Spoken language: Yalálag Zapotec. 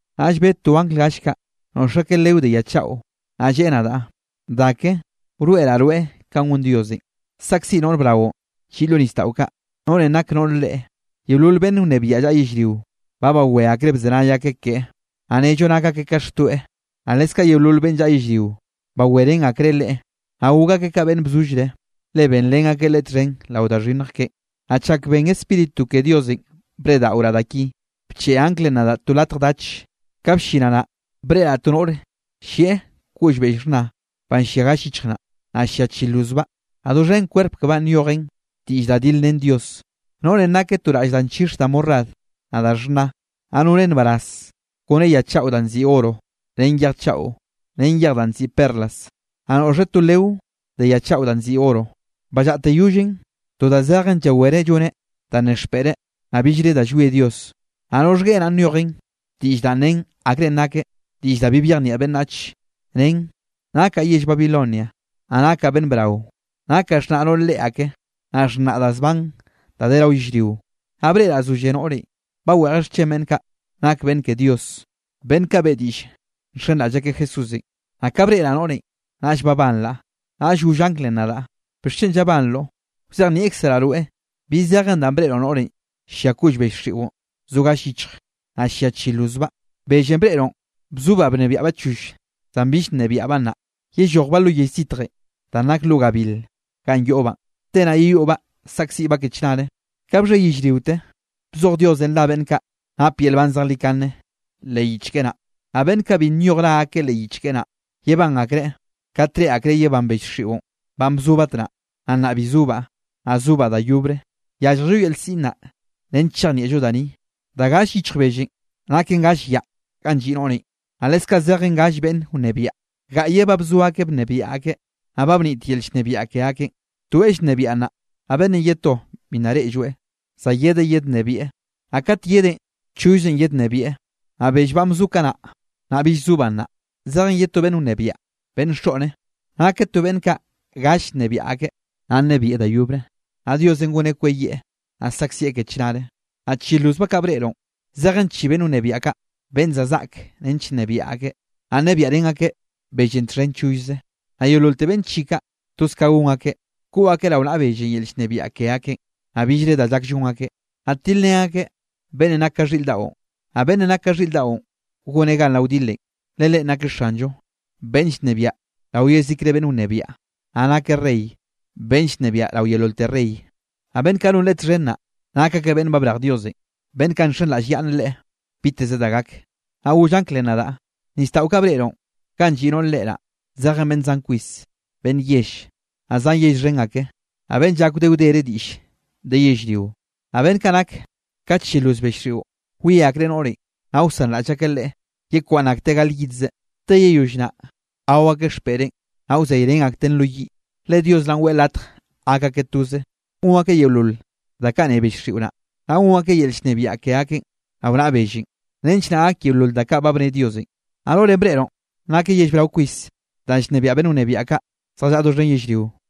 Naꞌll bed to angl gall kaꞌ noꞌx akeꞌ leo de ya chaꞌo, naꞌ lleꞌe nadaꞌ: —Da ke, wroeꞌraꞌ rweꞌ kanꞌ gon Diosenꞌ saꞌkziꞌ noꞌr braꞌon lliꞌ lo nisdaꞌo kaꞌ, noꞌrenꞌ nak noꞌr reꞌe. Yeolol beꞌnn wnebiaꞌ llaꞌa yellrio, ba bawé akreꞌ bzenay akeꞌ keꞌe, naꞌ nnello nak akeꞌ ka xtoeꞌ, naꞌ leskaꞌ yeolol beꞌnn llaꞌa yellrio, bawerén akreꞌ leꞌe, naꞌ gok akeꞌ ka beꞌnn bzollreꞌ, le benrén akeꞌ leꞌe txhen rao da xhinnj keꞌen. Naꞌ chak ben Spíritu ke Diosenꞌ breꞌdaꞌoraꞌ da ki, bcheꞌe anglenꞌ nadaꞌ to latj dache. Ka bllinaꞌ naꞌ, breꞌraꞌ to noꞌre llieꞌ koꞌll bell xhna banꞌ llia gall yichj naꞌ, naꞌ llia chi lozbaꞌ, naꞌ doxhen kwerp kebaꞌn nyojen diꞌll da dilrén Dios. Noꞌrenꞌ nakeꞌ to raꞌll danꞌ nchix da morad naꞌ da xhna, naꞌ noneꞌ nbaraz kone ya chaꞌo danꞌ nziꞌi oro, ren yej chaꞌo, ren yej danꞌ nziꞌi perlas. Naꞌ noꞌxeꞌ to leo de ya chaꞌo danꞌ nziꞌi oro, ballaꞌte yollen to da zejen llawereꞌ lloneꞌ da nen ke xpeꞌreꞌ, naꞌ billre da llwie Dios. Naꞌ roxhgueꞌe naꞌ, nyojen diꞌll da nen akre nakeꞌ, diꞌll da bi byejnieꞌ beꞌnnach, nen: “Nakaꞌ yell Babilonia, naꞌ nakaꞌ beꞌnn brao. Nakaꞌ xhnaꞌ noꞌr reꞌe ake, naꞌ xhnaꞌ da zban da de rao yellrionꞌ.” Naꞌ breꞌraꞌ zolle noꞌrenꞌ, baweꞌjeꞌ xchen beꞌnn kaꞌ nake beꞌnn ke Dios, beꞌnn kaꞌ beꞌe diꞌll nxenraꞌll akeꞌ Jesúsenꞌ. Naꞌ ka breꞌraꞌ noꞌrenꞌ, naꞌll babanraꞌ. Naꞌll goll anglenꞌ nadaꞌ: —¿Bixchen llabanroꞌ? Wzejnieꞌkzeraꞌ rweꞌ bi zejen danꞌ breꞌroꞌ noꞌrenꞌ llia koꞌll bell xiꞌon zo gall yichj, naꞌ llia chi lozbaꞌ. Bellenꞌ breꞌroꞌn bzobaꞌ bnebiaꞌbaꞌ choll, zan bill nnebiaꞌbaꞌ nnaꞌ, yellojbaꞌ lo yell zitjenꞌ danꞌ nak lo gabil ganꞌ yoꞌbaꞌn. Te naꞌ yeyoꞌbaꞌ saꞌkziꞌbaꞌ ke chnare. Ka bxhe yellriote bzoj Diosenꞌ ra beꞌnn kaꞌ nap yel nban zejlikane leꞌ yich keꞌe naꞌ. Naꞌ beꞌnn kaꞌ bi nyoj ra akeꞌ leꞌ yich keꞌe naꞌ, yebán akreꞌ kat reꞌe akreꞌ yebán bell xiꞌon, banꞌ bzo batnaꞌ, naꞌ nnaꞌ bi zobaꞌ, naꞌ sobaꞌ da yobre. Yálljello yel siꞌn naꞌ, nench chejnieꞌllo da ni. Da gall yichj bellenꞌ naken gall yaꞌ ganꞌ lliꞌ noꞌrenꞌ. Naꞌ leskaꞌ zejen gall beꞌnne wnebiaꞌ. Gaꞌyeꞌ ba bzo akeꞌ bnebiaꞌ akeꞌ, naꞌ ba bnit yel llnebiaꞌ ke akeꞌn. Toeꞌ llnebiaꞌ nnaꞌ, naꞌ beꞌnnenꞌ ye to bi nna reꞌlloeꞌ, za yedeꞌ yednnebieꞌ, naꞌ kat yedeꞌn chollze yednnebieꞌ. Naꞌ bell banꞌ bzo kanaꞌ, naꞌ bill zobaꞌ nnaꞌ, zejen ye to beꞌnn wnebiaꞌ, beꞌnn xoꞌne. Nakeꞌ to beꞌnn kaꞌ galle bnebiaꞌ akeꞌ, naꞌ nnebieꞌ da yobre, naꞌ Diosenꞌ goneꞌ kweyieꞌ, naꞌ saꞌkzieꞌ ke chnare. ’Naꞌ chi lozbaꞌ kaꞌ breꞌroꞌn, zejen chi beꞌnn wnebiaꞌ kaꞌ beꞌnn za zaꞌke nench nnebiaꞌ akeꞌ. Naꞌ nnebiaꞌrén akeꞌ bellenꞌ txhen chollze. Naꞌ yeololte beꞌnn chi kaꞌ, toz ka gon akeꞌ, koꞌ akeꞌ rao naꞌa bellenꞌ yel llnebiaꞌ ke akeꞌn, naꞌ billre da llak llon akeꞌ. Naꞌ tilrén akeꞌ beꞌnnenꞌ nak ka xhiꞌr daꞌon, naꞌ beꞌnnenꞌ nak ka xhiꞌr daꞌon goneꞌ gan rao wdilenꞌ, le Leꞌen nakeꞌ Xanllo, beꞌnn llnebiaꞌ rao yezikre beꞌnn wnebiaꞌ, naꞌ nakeꞌ Rey, beꞌnn llnebiaꞌ rao yeololte rey. Naꞌ beꞌnn kaꞌ non leꞌe txhen naꞌ, nak akeꞌ beꞌnn ba brej Diosenꞌ, beꞌnn kaꞌ nxenraꞌll akyaꞌnneꞌ Leꞌe biteze da gak. Naꞌll goll anglenꞌ nadaꞌ: —Nisdaꞌo kaꞌ breꞌroꞌ ganꞌ lliꞌ noꞌre reꞌe naꞌ, zejen beꞌnn zan kwis, beꞌnn yell, naꞌ zan yell xhen ake, naꞌ beꞌnn llak wde wdere diꞌll de yellrio. Naꞌ beꞌnn kaꞌ nak ka chi loz bell xiꞌo, wie akreꞌ noꞌrenꞌ, naꞌ wsanraꞌll akeꞌ leꞌe yekwaꞌnn akteꞌ gal yidze, te yeyoll naꞌ, gao akeꞌ xpeꞌreꞌn, naꞌ wzeyrén akteꞌn lo yiꞌ. Le Dios naꞌn weꞌe latj gak akeꞌ toze, gon akeꞌ yeolol da kaꞌ nne bell xiꞌo naꞌ, naꞌ gon akeꞌ yel llnebiaꞌ ke akeꞌn rao naꞌa bellenꞌ, nench naꞌ gak yeolol da kaꞌ ba bne Diosenꞌ. Naꞌ noꞌrenꞌ breꞌroꞌn nakeꞌ yell brao kwis da llnebiaꞌ beꞌnn wnebiaꞌ kaꞌ zjallaꞌa doxhen yellrio.